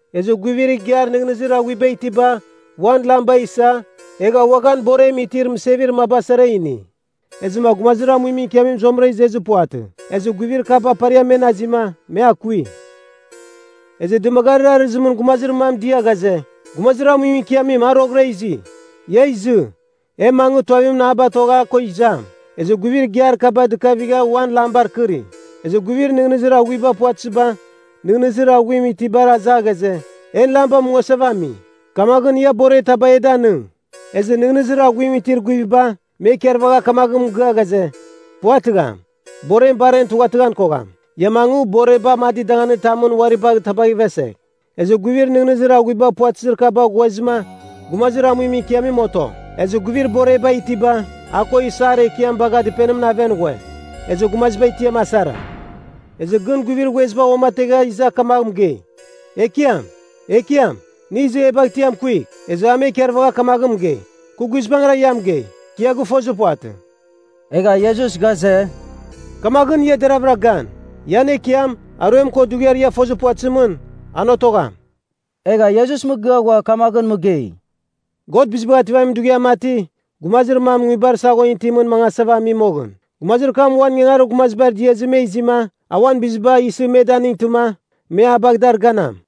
Ezɨ guivir igiar nɨghnɨzir aghuiba itiba, uan lamba isa, egha uaghan borem itir mɨsevir maba sara, ini. Ezɨma gumazir amuimɨn ikiamim zuamɨra izezir puvatɨ, ezɨ guivir kaba pariam men azima, me akui. “Ezɨ dɨmagarir arɨzimɨn gumazir mam dia ghaze, ‘Gumazir amuimɨn ikiamim, a roghɨra izi. Ia izɨ, e mangɨ, tuavimɨn a batogh a ko izam.’ Ezɨ guivir igiar kaba dɨkavigha uan lambar kɨri. Ezɨ guivir nɨghnɨzir aghuiba puvatɨziba, nɨghnɨzir aghuim itibar aza ghaze, ‘En lamba mungasava ami. Kamaghɨn, ia borer taba e danɨng.’ Ezɨ nɨghnɨzir aghuim itir guiviba, me ikarvagha kamaghɨn mɨgɨa ghaze, ‘Puvatɨgham! Borem bar en tughatɨghan kogham. Ia mangɨ, borer amadir danganitamɨn uari bagh tabagh ivesegh.’ Ezɨ guivir nɨghnɨzir aghuiba puvatɨzir kaba ghuezɨma, gumazir amuimɨn ikiamim oto. Ezɨ guivir boreba itiba, a ko isar ekiam bagha dɨpenimɨn aven ghue. Ezɨ gumaziba tiam asara. “Ezɨ gɨn guivir ghueziba uamategha iza kamagh mɨgei, ‘Ekiam! Ekiam, nɨ izɨ e bagh tiam kuigh.’ Ezɨ a me ikarvagha kamaghɨn mɨgei, ‘Kɨ guizbangɨra ia mɨgei, kɨ ia gɨfozir puvatɨ.’” Egha Iesus ghaze, “Kamaghɨn, ia deraghavɨra gan. Ian Ekiam, aruem ko dughiar ia fozir puvatɨzimɨn, an otogham.” Egha Iesus mɨgɨa ghua kamaghɨn mɨgei, “God Bizibagh Ativamin Dughiam mati, gumazir mam nguibar saghon itimɨn mangasava ami moghɨn. Gumazir kam uan ingangarir gumazibar diazɨ me izima, a uan biziba isɨ, me danightɨma, me a bagh dar ganam.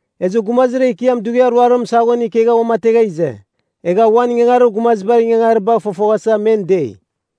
“Ezɨ gumazir ekiam dughiar ruarimɨn saghon ikegha uamategha ize. Egha uan ingangarir gumazibar ingangaribagh fofoghasa men dei.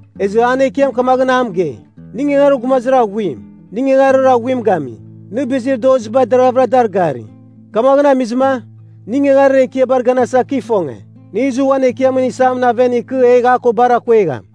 “Ezɨ an ekiam kamaghɨn a mɨgei, ‘Nɨ ingangarir gumazir aghuim, nɨ ingangarir aghuim gami. Nɨ bizir doziba deravɨra dar gari. Kamaghɨn amizɨma, nɨ ingangarir ekiabar ganasa, kɨ ifonge. Nɨ izɨ uan ekiamɨn isamɨn aven ikɨ, egh a ko bar akuegham.’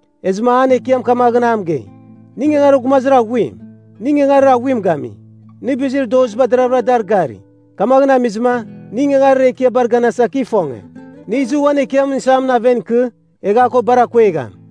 Ezɨma an ekiam kamaghɨn a mɨgei, ‘Nɨ ingangarir gumazir aghuim, nɨ ingangarir aghuim gami. Nɨ bizir doziba deravɨra dar gari. Kamaghɨn amizɨma, nɨ ingangarir ekiabar ganasa, kɨ gifonge. Nɨ izɨ, uan ekiamɨn isamɨn aven ikɨ, egh a ko bar akuegham.’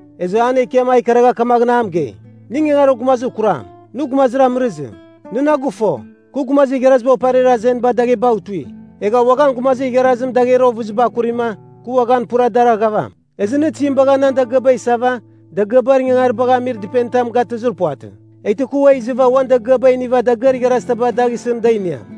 “Ezɨ an ekiam a ikaragha kamaghɨn a mɨgei, ‘Nɨ ingangarir gumazir kuram! Nɨ gumazir amɨrɨzim. Nɨ na gɨfo, kɨ gumazir igharaziba oparir azenibar daghebagh tui. Egha uaghan gumazir igharazim dagher ovɨziba akurima, kɨ uaghan pura dar aghavam. Ezɨ nɨ tizim bagha nan dagɨaba isava, dagɨabar ingaribagh amir dɨpenitam gatɨzir puvatɨ? Eghtɨ kɨ ua izɨva, uan dagɨaba iniva dagɨar igharazitaba dagh isɨn da iniam.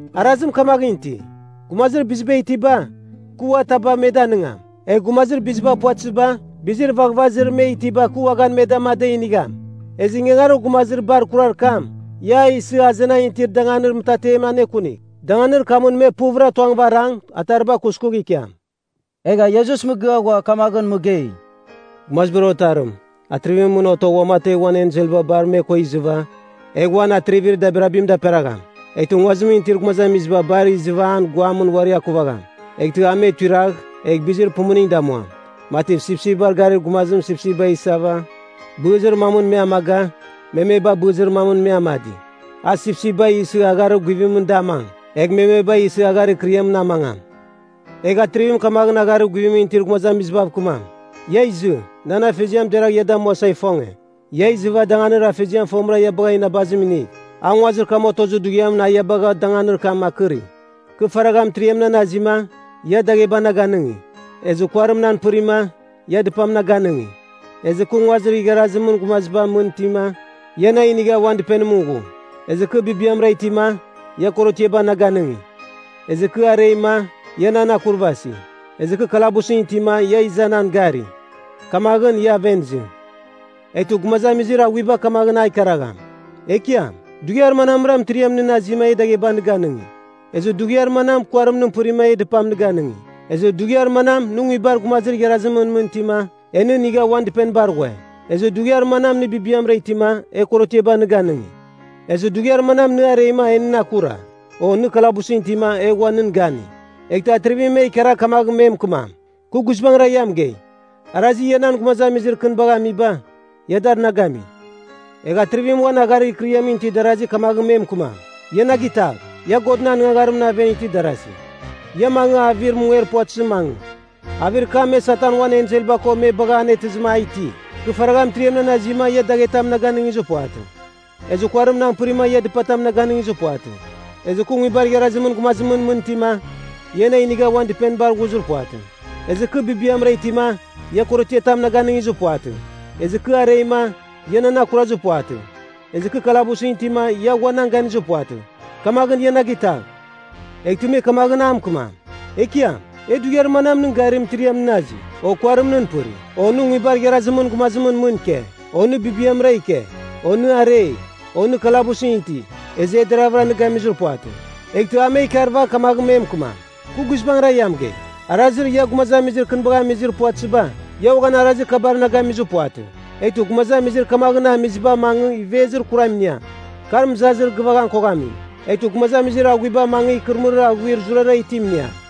Arazim kamaghɨn iti, gumazir biziba itiba, kɨ ua taba me danɨngam. Egh gumazir biziba puvatɨziba, bizir vaghvazir me itiba kɨ uaghan me dama, da inigham. Ezɨ ingangarir gumazir bar kurar kam, ia a isɨ, azenan itir danganir mɨtatemɨn anekunigh. Danganir kamɨn me puvɨra tuangɨva arang, atariba kuskugh ikiam.’” Egha Iesus mɨgɨa ghua kamaghɨn mɨgei, “Gumazibar Otarim, Atrivimɨn mɨn otogh uamategh uan enselba bar me ko izɨva, egh uan atrivir dabirabim daperagham. Eghtɨ nguazimɨn itir gumazamiziba bar izɨva an guamɨn uari akuvagham. Eghtɨ a me tuiragh, egh bɨzir pumuning damuam, mati sipsipbar garir gumazim sipsipba isava, bɨzir mamɨn me amaga, memeba bɨzir mamɨn me amadi. A sipsipba isɨ agharir guvimɨn da amang, egh memeba isɨ agharir ikɨriamɨn amangam. Egh Atrivim kamaghɨn agharir guvimɨn itir gumazamizibav kɨmam, ‘Ia izɨ, nan Afeziam deragh ia damuasa ifonge! Ia izɨva, danganir Afeziam fomɨra ia bagha inabazim inigh, a nguazir kam otozir dughiamɨn a ia bagha danganir kam akɨri. Kɨ faragha mɨtiriam nan azima, ia dagheba na ganɨngi; ezɨ kuarim nan pɨrima, ia dɨpam na ganɨngi; ezɨ kɨ nguibar igharazimɨn gumazimɨn mɨn itima, ia na inigha uan dɨpenimɨn ghu; ezɨ kɨ bibiamra itima, ia korotiaba na ganɨngi; ezɨ kɨ areima, ia nan akurvasi; ezɨ kɨ kalabusɨn itima ia iza nan gari. Kamaghɨn, ia aven izɨ.’ “Eghtɨ gumazamizir aghuiba kamaghɨn a ikaragham, ‘Ekiam, dughiar manamra, mɨtiriam nɨn azima, e dagheba nɨ ganɨngi? Ezɨ dughiar manam, kuarim nɨn pɨrima, e dɨpam nɨ ganɨngi? Ezɨ dughiar manam, nɨ nguibar gumazir igharazimɨn mɨn itima, e nɨ inigha uan dɨpenibar ghue? Ezɨ dughiar manam, nɨ bibiamra itima, e korotiaba nɨ ganɨngi? Ezɨ dughiar manam, nɨ areima, en nɨn akura, o nɨ kalabusɨn itima, e ghua nɨn gani?’ “Eghtɨ Atrivim me ikaragh kamaghɨn me mɨkɨmam, ‘Kɨ guizbangɨra ia mɨgei, arazir ia nan gumazamizir kɨnibagh amiba, ia dar na gami.’ “Egh Atrivim uan agharir ikɨriamɨn itir darazi kamaghɨn me mɨkɨmam, ‘Ia na gitagh! Ia Godɨn anɨngagharimɨn aven itir darasi! Ia mangɨ, avir munger puvatɨzimɨn mangɨ. Avir kam, me Satan uan enselba ko me bagha anetɨzɨma a iti. Kɨ faragha mɨtiriam nan azima, ia daghetam na ganɨngizir puvatɨ; ezɨ kuarim nan pɨrima, ia dɨpatam na ganɨngizir puvatɨ; ezɨ kɨ nguibar igharazimɨn gumazimɨn mɨn itima, ia na inigha uan dɨpenibar ghuzir puvatɨ; ezɨ kɨ bibiamra itima, ia korotiatam na ganɨngizir puvatɨ; ezɨ kɨ areima, ia nan akurazir puvatɨ; ezɨ kɨ kalabusɨn itima, ia ghua nan ganizir puvatɨ. Kamaghɨn, ia na gitagh!’ “Eghtɨ me kamaghɨn a mɨkɨmam, ‘Ekiam, e dughiar manam nɨn gari, mɨtiriam nɨn azi, o kuarim nɨn pɨri, o nɨ nguibar igharazimɨn gumazimɨn mɨn ike, o nɨ bibiamra ike, o nɨ arei, o nɨ kalabusɨn iti, ezɨ e deravɨra nɨ gamizir puvatɨ?’ “Eghtɨ a me ikarvagh kamaghɨn me mɨkɨmam, ‘Kɨ guizbangɨra ia mɨgei, arazir ia gumazamizir kɨnibagh amizir puvatɨziba, ia uaghan arazir kabar na gamizir puvatɨ.’ Eghtɨ gumazamizir kamaghɨn amiziba mangɨ, ivezir kuram iniam, kar mɨzazir gɨvan koghamim. Eghtɨ gumazamizir aghuiba mangɨ, ikɨrɨmɨrir aghuir zurara itim iniam.”